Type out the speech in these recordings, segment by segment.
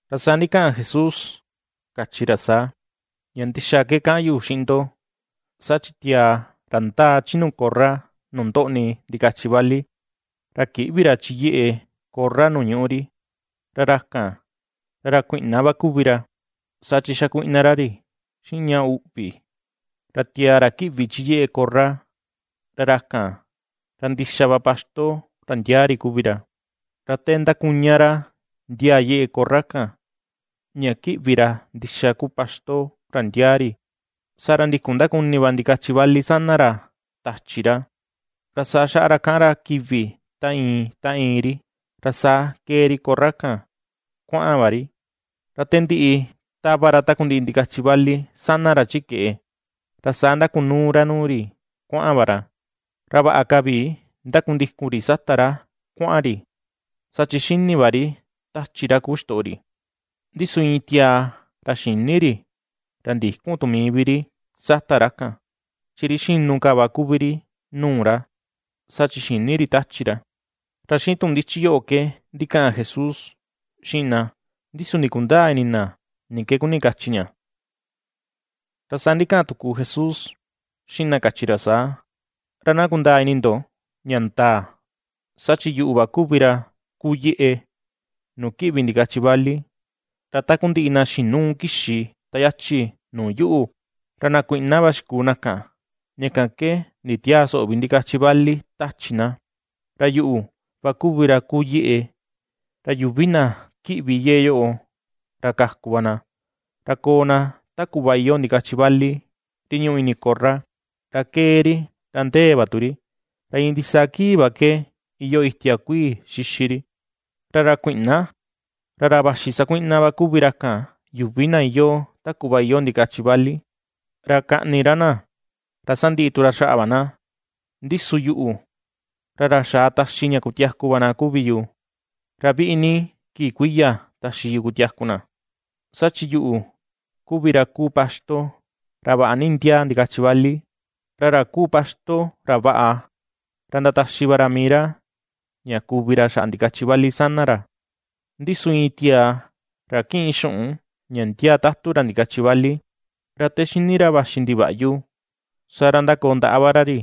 Ra saa ndikaꞌan Jesús kachi ra saa: ―Ña ndixa ke kaꞌan yu xiꞌin ndo, saa chi tiaa ra ndaa chi nuu korra nuu ndoꞌni ndikachi vali, ra kïꞌvi ra chi yeꞌe korra nu ñuꞌu ri, ra ra kan, ra ra kuiꞌna va kuvi ra, saa chi xakuiꞌna ra ri xiꞌin ña uꞌvi. Ra tiaa ra kiꞌvi chi yeꞌe korra, ra ra kan ra ndixa va paxto ra ndiaa ri kuvi ra. Ra te ^ndakuña ra ndiaa yeꞌe korra kan, ña ^kiꞌvi ra ndixa kuu paxto ra ndiaa ri, saa ra ndikun ndakuni va ndikachi vali sana ra tachi ra, ra saa xaꞌa ra kaꞌan ra kivi ta iin ta iin ri, ra saa kee ri korra kan kuaꞌan va ri. Ra te ndiꞌi tava ra takundiꞌi ndikachi vali sana ra chi keꞌe, saa ra ndakunuu ra nuu ri kuaꞌan va ra, ra vaꞌa ka vi ndakundikun ri sata ra kuaꞌan ri, saa chi xini va ri tachi ra kuu ixtoꞌo ri. Ndi su iin tiaa ra xïni ri, ra ndïkun tu mii vi ri sata ra kan, chi ri xinu ka va kuvi ri nuu ra, saa chi xïni ri tachi ra. Ra xiꞌin tuꞌun ndichi yoꞌo ke ndikaꞌan Jesús xiꞌin na, ndi su ndikundäa ini na, ni ke kuni kachi ña. Ra saa ndikaꞌan tuku Jesús xiꞌin na kachi ra saa: ―Ra na kundaa ini ndo ña ndaa: Saa chi yuꞌu va kuvi ra kuu yeꞌe nuu kiꞌvi ndikachi vali. Ra takundiꞌi na xinuu kixi ta yachi nuu yuꞌu, ra na kuiꞌna va xikuu na kan, ña kan ke nditiäa soꞌo vi ndikachi vali tachi na. Ra yuꞌu va kuvi ra kuu yeꞌe, ra yuvi na ^kiꞌvi yeꞌe yoꞌo, ra kaku va na. Ra koo na ta kuꞌva iyoo ndikachi vali ri ñuꞌu ini korra, ra ^kee ri, ra ndéé va tu ri, ra iin ndisaa kii va iyoo itia kuii xixi ri. ’Ra ra kuiꞌna, ra ra vaxi sakuiꞌna va kuvi ra kan, yuvi na iyoo ta kuꞌva iyoo ndikachi vali, ra kaꞌni ra na, ra sandiꞌi tu xaꞌa va na; ndi su yuꞌu, ra ra xaa taxi ña kutiaku va na kuvi yu, ra viꞌi ni kii kuiya taxi yu kutiaku na. Saa chi yuꞌu kuvi ra kuu paxto ra vaꞌa ni ndiaa ndikachi vali. Ra ra kuu paxto ra vaꞌa ra ndataxi va ra mii ra, ña kuvi ra xaꞌa ndikachi vali sana ra. Ndi su iin tiaa ra kiꞌin xuꞌun, ña ndiaa tatu ra ndikachi vali, ra te xini ra vaxi ndivaꞌyu, saa ra ndakoo ndaꞌa va ra ri,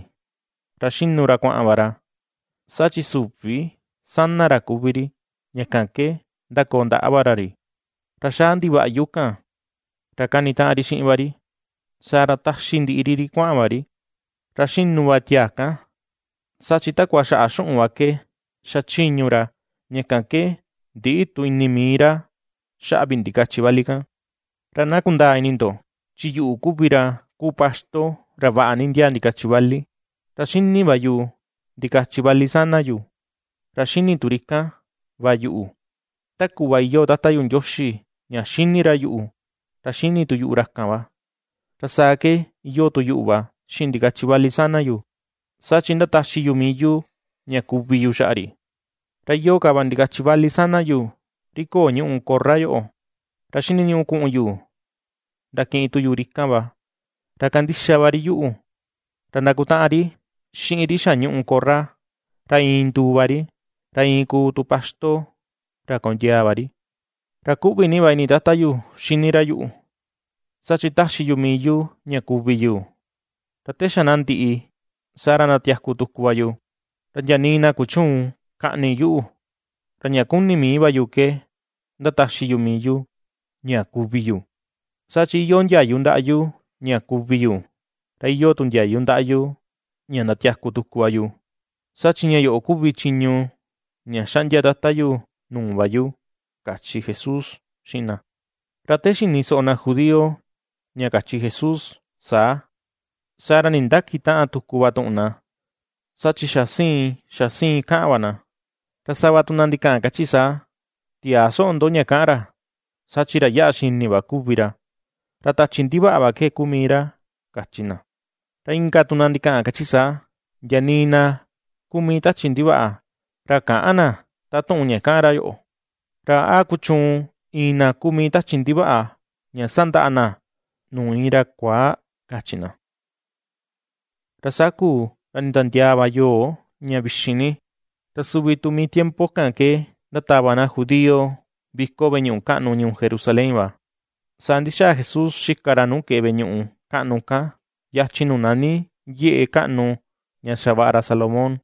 ra xinu ra kuaꞌan va ra, saa chi süvi sana ra kuvi ri, ña kan ke ndakoo va ra ri, ra xaa ndivaꞌyu kan ra kanitaꞌan ri xiꞌin va ri, saa ra taxi ndiꞌi ri ri kuaꞌan va ri. Ra xinu va tiaa kan, saa chi takua xaꞌa xuꞌun va ke xachiñu ra, ña kan ke ndïꞌi tu ini mii ra xaꞌa vi ndikachi vali kan. ’Ra na kundaa ini ndo chi yuꞌu kuvi ra kuu paxto ra vaꞌa ni ndiaa ndikachi vali. Ra xini va yu ndikachi vali sana yu, ra xini tu ri kan va yuꞌu, ta kuꞌva iyoo Tata yu Ndioxi ña xini ra yuꞌu, ra xini tu yuꞌu ra kan va, ra saa ke iyoo tu yuꞌu va xiꞌin ndikachi vali sana yu, saa chi ^ndataxi yu mii yu ña kuvi yu xaꞌa ri. Ra iyoo ka va ndikachi vali sana yu, ri köo ñuꞌu korra yoꞌo, ra xiniñuꞌu kuꞌun yu ndakiꞌin tu yu ri kan va, ra kandixa va ri yuꞌu, ra ndakutaꞌan ri xiꞌin ri xa ñuꞌu korra, ra iin nduu va ri, ra iin kuu tu paxto, ra kondiaa va ri. ’Ra kuꞌvi ni va ini Tata yu xini ra yuꞌu, saa chi ^taxi yu mii yu ña kuvi yu, ra te xa na ndiꞌi, saa ra ndatiaku tuku va yu. Ra ndia nii na kuchüun kaꞌni yuꞌu, ra ña kuni mii va yu ke ^ndataxi yu mii yu ña kuvi yu. Saa chi iyoo ndiayu ndaꞌa yu ña kuvi yu, ra iyoo tu ndiayu ndaꞌa yu ña ndatiaku tuku va yu. Saa chi ña yoꞌo kuvi chiñu ña xaꞌndia Tata yu nuu va yu ―kachi Jesús xiꞌin na. Ra te xini soꞌo na judío ña kachi Jesús saa, saa ra nindakitäꞌan tuku va tuꞌun na, saa chi xa siin xa siin kaꞌan va na. Ra sava tu na ndikaꞌan kachi na saa: ―Tiäa soꞌo ndo ña kaꞌan ra, saa chi ra yaꞌa xini va kuvi ra, ra tachi ndivaꞌa va ke kuu mii ra ―kachi na. Ra inka tu na ndikaꞌan, kachi saa: ―Ndia nii na kuu mii tachi ndivaꞌa, ra käꞌan na, taꞌan tuꞌun ña kaꞌan ra yoꞌo. ¿Ra a kuchuun iin na kuu mii tachi ndivaꞌa ña sandaꞌa na nuu iin ra kuaa? ―kachi na. Ra saa kuu, ra nditiandiaa va yoo ña vixin ni, ra suvi tu mii tiempo kan ke ndatava na judío viko veꞌe ñuꞌu kaꞌnu ñuu Jerusalén va. Saa ndixaa Jesús xika ra nuu keꞌe veꞌe ñuꞌu kaꞌnu kan, yachin nuu nani yeꞌe kaꞌnu ña xavaꞌa ra Salomón,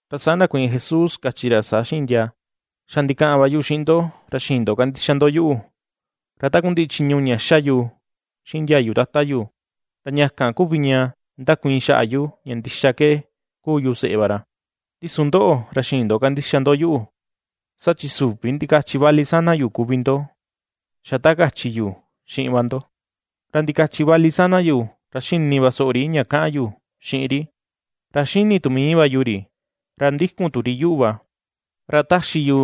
Ra saa ndakuiin Jesús kachi ra saa xiꞌin ndia: ―Xa ndikaꞌan va yu xiꞌin ndo, ra xïin ndo kandixa ndo yuꞌu. Ra takundiꞌi chiñu ña ^xa yu xiꞌin ndiayu Tata yu, ra ña kan kuvi ña ndakuiin xaꞌa yu ña ndixa ke kuu yu seꞌe va ra. Ndi su ndoꞌo ra xïin ndo kandixa ndo yuꞌu, saa chi süvi ndikachi vali sana yu kuvi ndo, xa ta kachi yu xiꞌin va ndo. Ra ndikachi vali sana yu, ra xini va soꞌo ri ña kaꞌan yu xiꞌin ri, ra xini tu mii va yu ri, ra ndikun tu ri yuꞌu va. Ra ^taxi yu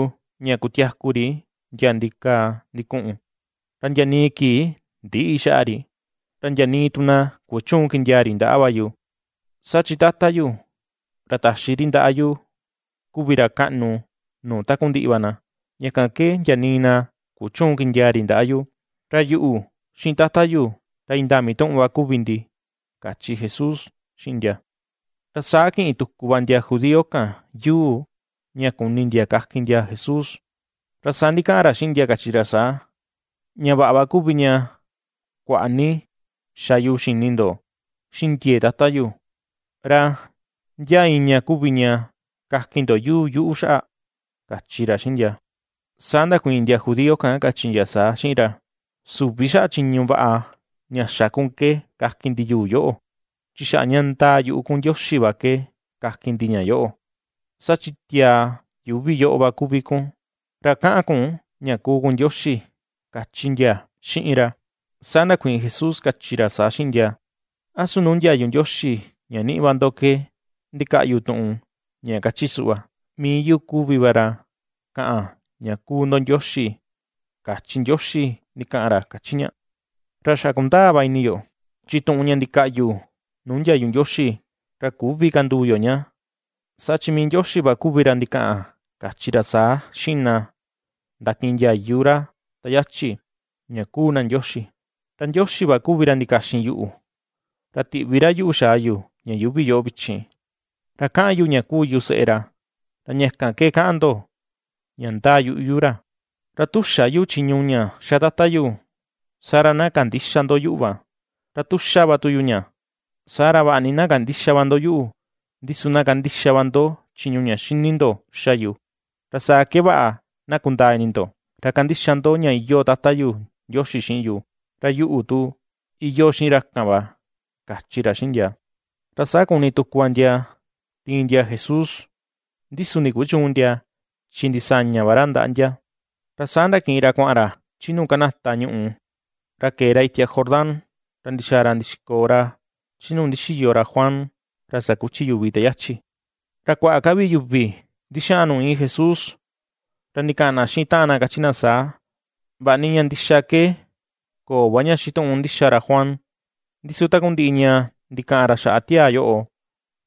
ña kutiaku ri ndia ndikaa ndikuꞌun, ra ndia nii kii ndïꞌi xaꞌa ri, ra ndia nii tu na kuchüun kindiaa ri ndaꞌa va yu. Saa chi Tata yu, ra taxi ri ndaꞌa yu, kuvi ra kaꞌnu nuu takundiꞌi va na, ña kan ke ndia nii na kuchüun kindiaa ri ndaꞌa ra. Ra Yuꞌu, xiꞌin Tata yu, ra indaa mituꞌun va kuvi ndi ―kachi Jesús xiꞌin ndia. Ra saa kiꞌin tuku va ndia judío kan yuu, ña kuni ndia kakin ndia Jesús. Ra saa ndikaꞌan ra xiꞌin ndia kachi ra saa: ―Ña vaꞌa va kuvi ña kuaꞌa ni xa yu xini ndo, xiꞌin ndiee Tata yu; ¿ra ndia iin ña kuvi ña kakin ndo yuu yuꞌu xaꞌa? ―kachi ra xiꞌin ndia. Saa ndakuiin ndia judío kan kachi ndia saa xiꞌin ra: ―Süvi xaꞌa chiñu vaꞌa ña xa kun ke kakin ndi yuu yoꞌo, chi xaꞌa ña ndaa yuꞌu kun Ndioxi va ke kakin ndi ña yoꞌo. Saa chi tiaa yuuvi yoꞌo va kuvi kun, ra kaꞌan kun ña kuu kun Ndioxi ―kachi ndia xiꞌin ra. Saa ndakuiin Jesús kachi ra saa xiꞌin ndia: ―¿A su nuu ndiayu Ndioxi ña niꞌi va ndo ke ndikaꞌyu tuꞌun ña kachi suꞌva: “Mii yu kuvi va ra kaꞌan ña kuu ndo ndioxi”, kachi Ndioxi, ndikaꞌan ra kachi ña? Ra xa kundaa va ini yo, chi tuꞌun ña ndikaꞌyu nuu ndiayu Ndioxi, ra küvi kanduu yo ña; saa chi mii Ndioxi va kuvi ra ndikaꞌan kachi ra saa xiꞌin na ndakiꞌin ndiayu ra ta yachi, ña kuu na ndioxi. Ra Ndioxi va kuvi ra ndikaxin yuꞌu, ra tiꞌvi ra yuꞌu xaa yu ña yuuvi yoꞌo vichin, ra kaꞌan yu ña kuu yu seꞌe ra, ra ña kan ke kaꞌan ndo, ña ndaa yuꞌu yu ra. Ra tu xä yu chiñu ña ^xa Tata yu, saa ra na kandïxa ndo yuꞌu va. Ra tu ^xa va tu yu ña, saa ra vaꞌa ni na kandïxa va ndo yuꞌu, ndi su na kandixa va ndo chiñu ña xini ndo ^xa yu, ra saa ke vaꞌa na kundaa ini ndo ra kandixa ndo ña iyoo Tata yu Ndioxi xiꞌin yu, ra yuꞌu, tu iyoo xiꞌin ra kan va ―kachi ra xiꞌin ndia. Ra saa kuni tuku va ndia tiin ndia Jesús, ndi su ndikuchüun ndia, chi ndisaña va ra ndaꞌa ndia. Ra saa ndakiꞌin ra kuaꞌan chi nuu kanata ñuꞌù, ra kee ra itia Jordán ra ndixaa ra ndixikoo ra chi nuu ndixiyo ra Juan ra sakuchi yuvi te yachi. Ra kuaꞌa ka vi yuvi ndixaꞌan nuu iin Jesús, ra ndikaꞌan na xiꞌin taꞌan na kachi na saa: ―Vaꞌa ni ña ndixa ke köo va ña xituꞌun ndixa ra Juan, ndi su takundiꞌi ña ndikaꞌan ra xaꞌa tiaa yoꞌo,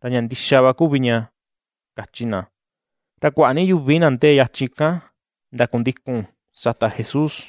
ra ña ndixa va kuvi ña ―kachi na. Ra kuaꞌa ni yuvi na ndee yachin kan, ndakundikun sata Jesús.